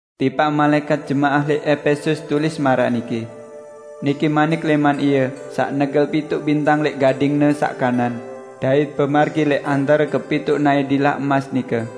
"Tipaq malaẽkat jemaah lẽq Epesus, tulis maraq niki: Niki manik lẽman Ie saq negel pituq bintang lẽq gading-Ne saq kanan, dait bemargi lẽq antare kepituq naẽ dilah emas nike.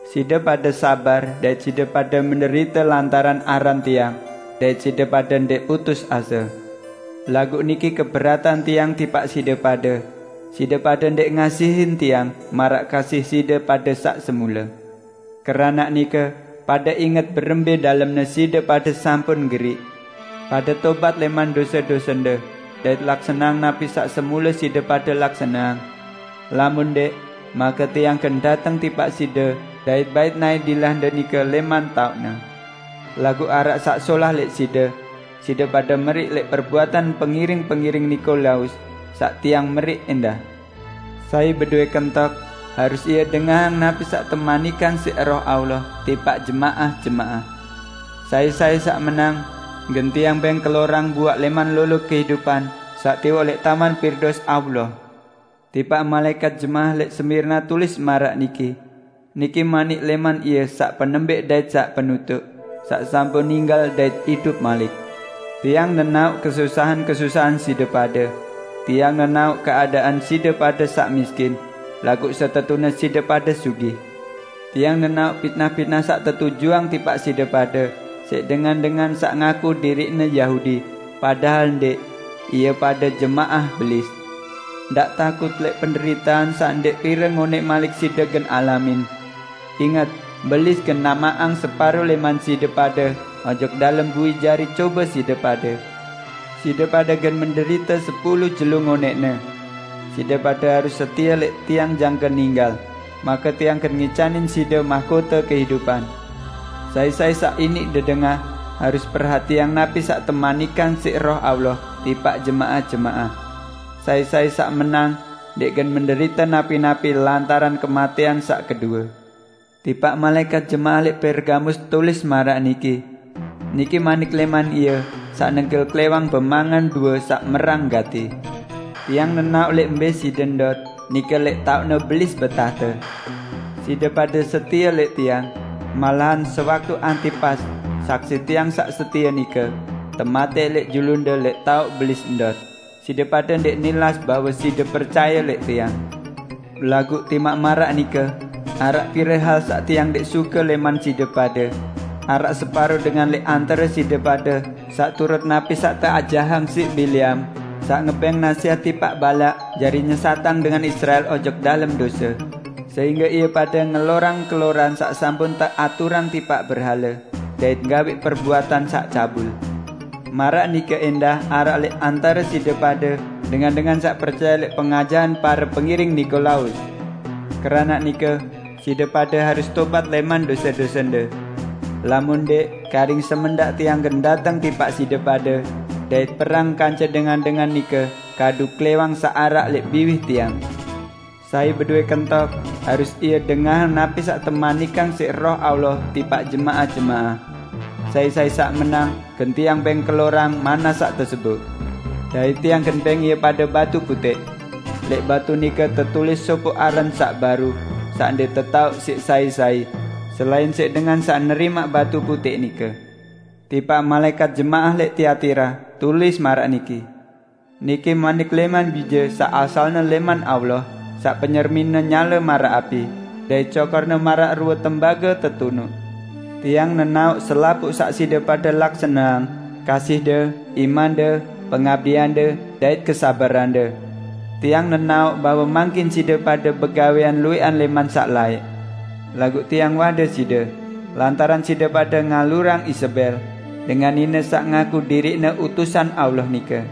Side pade sabar dait side pade menderite lantaran aran Tiang, dait side pade ndẽq putus ase. Laguq niki keberatan Tiang tipaq side pade: Side pade ndẽq ngasihin Tiang maraq kasih side pade saq semule. Keranaq nike pade inget berembẽ dalemne side pade sampun geriq! Pade tobat lẽman dose-dosende, dait laksaneang napi saq semule side pade laksaneang. Lamun ndẽq, make Tiang gen dateng tipaq side dait bait naẽ dilahde nike lẽman taoqne. Laguq araq saq solah lẽq side: Side pade meriq lẽq perbuatan pengiring-pengiring Nikolaus, saq Tiang meriq ẽndah. Sai bedowẽ kentok, harus ie dengahang napi saq temanikang siq Roh Allah tipaq jemaah-jemaah! Sai-sai saq menang, gen Tiang bẽng kelorang buaq lẽman lolo kehidupan saq tiwoq lẽq Taman Pirdaus Allah." "Tipaq malaẽkat jemaah lẽq Smirna tulis maraq niki: Niki manik lẽman Ie saq penembẽq dait saq penutuq -- saq sampun ninggal dait idup malik. Tiang nenaoq kesusahan-kesusahan side pade; Tiang nenaoq keadaan side pade saq miskin -- laguq setetune side pade sugih! Tiang nenaoq pitnah-pitnah saq tetujuang tipaq side pade siq dengan-dengan saq ngaku diriqne Yahudi, padahal ndẽq; ie pade jemaah Belis! Ndaq takut lẽq penderitean saq ndẽq pire ngonẽq malik side gen alamin. Inget, Belis gen namaqang separo lẽman side pade ojok dalem bui jari cobe side pade. Side pade gen menderite sepulu jelo ngonẽqne. Side pade harus setie lẽq Tiang jangke ninggal, make Tiang gen ngicanin side mahkote kehidupan. Sai-sai saq iniq dedengah, harus perhatiang napi saq temanikang siq Roh Allah tipaq jemaah-jemaah! Sai-sai saq menang, ndẽq gen menderite napi-napi lantaran kematẽan saq kedue." "Tipaq malaẽkat jemaah lẽq Pergamus, tulis maraq niki: Niki manik lẽman Ie saq negel klẽwang bemangan due saq merang gati. Tiang nenaoq lẽq mbẽ side ndot, nike lẽq taoqne Belis betahte. Side pade setie lẽq Tiang, malahan sewaktu Antipas, saksi Tiang saq setie nike, tematẽq lẽq julunde lẽq taoq Belis ndot, side pade ndẽq nilas bahwe side percaye lẽq Tiang. Laguq timaq maraq nike, araq pire hal saq Tiang ndẽq suke lẽman side pade: Araq separo dengan lẽq antare side pade saq turut napi saq teajahang siq Bileam, saq ngebẽng nasẽhat tipaq Balak jari nyesatang dengan Israel ojok dalem dose, sehingge ie pade ngelorang keloran saq sampun teaturang tipaq berhale dait gawẽq perbuatan saq cabul. Maraq nike ẽndah araq lẽq antare side pade dengan-dengan saq percaye lẽq pengajahan pare pengiring Nikolaus. Keranaq nike, side pade harus tobat lẽman dose-dosende! Lamun ndẽq, karing semendaq Tiang gen dateng tipaq side pade dait perang kance dengan-dengan nike kadu klẽwang saq araq lẽq biwih Tiang. Sai bedowẽ kentok, harus ie dengahang napi saq temanikang siq Roh Allah tipaq jemaah-jemaah! Sai-sai saq menang, gen Tiang bẽng kelorang manna saq teseboq, dait Tiang gen bẽng ie pade batu putẽq. Lẽq batu nike tetulis sopoq aran saq baru, saq ndẽq tetaoq siq sai-sai, selain siq dengan saq nerimaq batu putẽq nike." "Tipaq malaẽkat jemaah lẽq Tiatira, tulis maraq niki: Niki manik lẽman Bije saq asalne lẽman Allah, saq penyermin-Ne nyale maraq api, dait cokor-Ne maraq rue tembage tetunuq. Tiang nenaoq selapuq saq side pade laksaneang, kasihde, imande, pengabdiande, dait kesabarande. Tiang nenaoq bahwe mangkin side pade begawẽan luwẽqan lẽman saq laẽq. Laguq Tiang wade side, lantaran side pade ngalurang Izebel, dengan nine saq ngaku diriqne utusan Allah nike.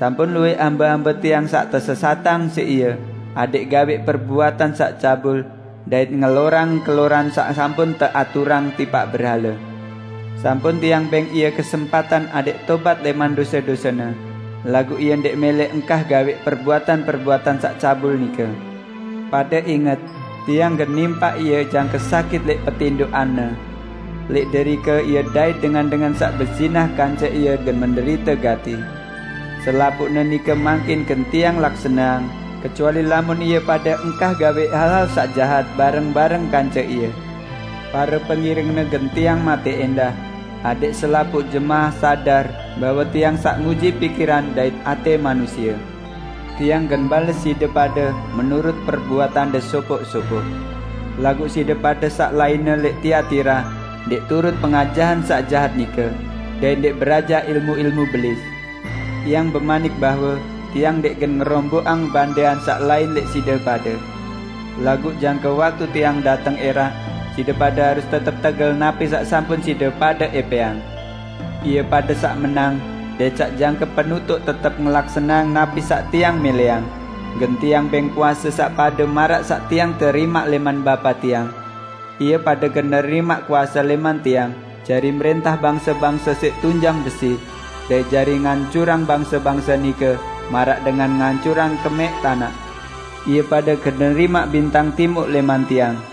Sampun luwẽq hambe-hambe Tiang saq tesesatang siq ie adẽq gawẽq perbuatan saq cabul dait ngelorang keloran saq sampun teaturang tipaq berhale. Sampun Tiang bẽng ie kesempatan adẽq tobat lẽman dose-dosene, laguq ie ndẽq mẽlẽ engkah gawẽq perbuatan-perbuatan saq cabul nike. Pade inget! Tiang gen nimpak ie jangke sakit lẽq petindoqanne. Lẽq derike ie dait dengan-dengan saq bezinah kance ie gen menderite gati. Selapuqne nike mangkin gen Tiang laksaneang -- kecuali lamun ie pade engkah gawẽq hal-hal saq jahat bareng-bareng kance ie. Pare pengiringne gen Tiang matẽq ẽndah adẽq selapuq jemaah sadar bahwe Tiang saq nguji pikiran dait atẽ manusie. Tiang gen bales side pade menurut perbuatande sopoq-sopoq. Laguq side pade saq lainne lẽq Tiatira ndẽq turut pengajahan saq jahat nike, dait ndẽq berajah ilmu-ilmu Belis. Tiang bemanik bahwe Tiang ndẽq gen ngeromboqang bandean saq lain lẽq side pade. Laguq jangke waktu Tiang dateng ẽraq, side pade harus tetep tegel napi saq sampun side pade ẽpẽang. Ie pade saq menang, dait saq jangke penutuq tetep ngelaksaneang napi saq Tiang mẽlẽang, gen Tiang bẽng kuase saq pade maraq saq Tiang terimaq lẽman Bapa Tiang. Ie pade gen nerimaq kuase lẽman Tiang jari mrẽntah bangse-bangse siq tunjang besi, dait jari ngancurang bangse-bangse nike maraq dengan ngancurang kemẽq tanaq. Ie pade gen nerimaq bintang timuq lẽman Tiang.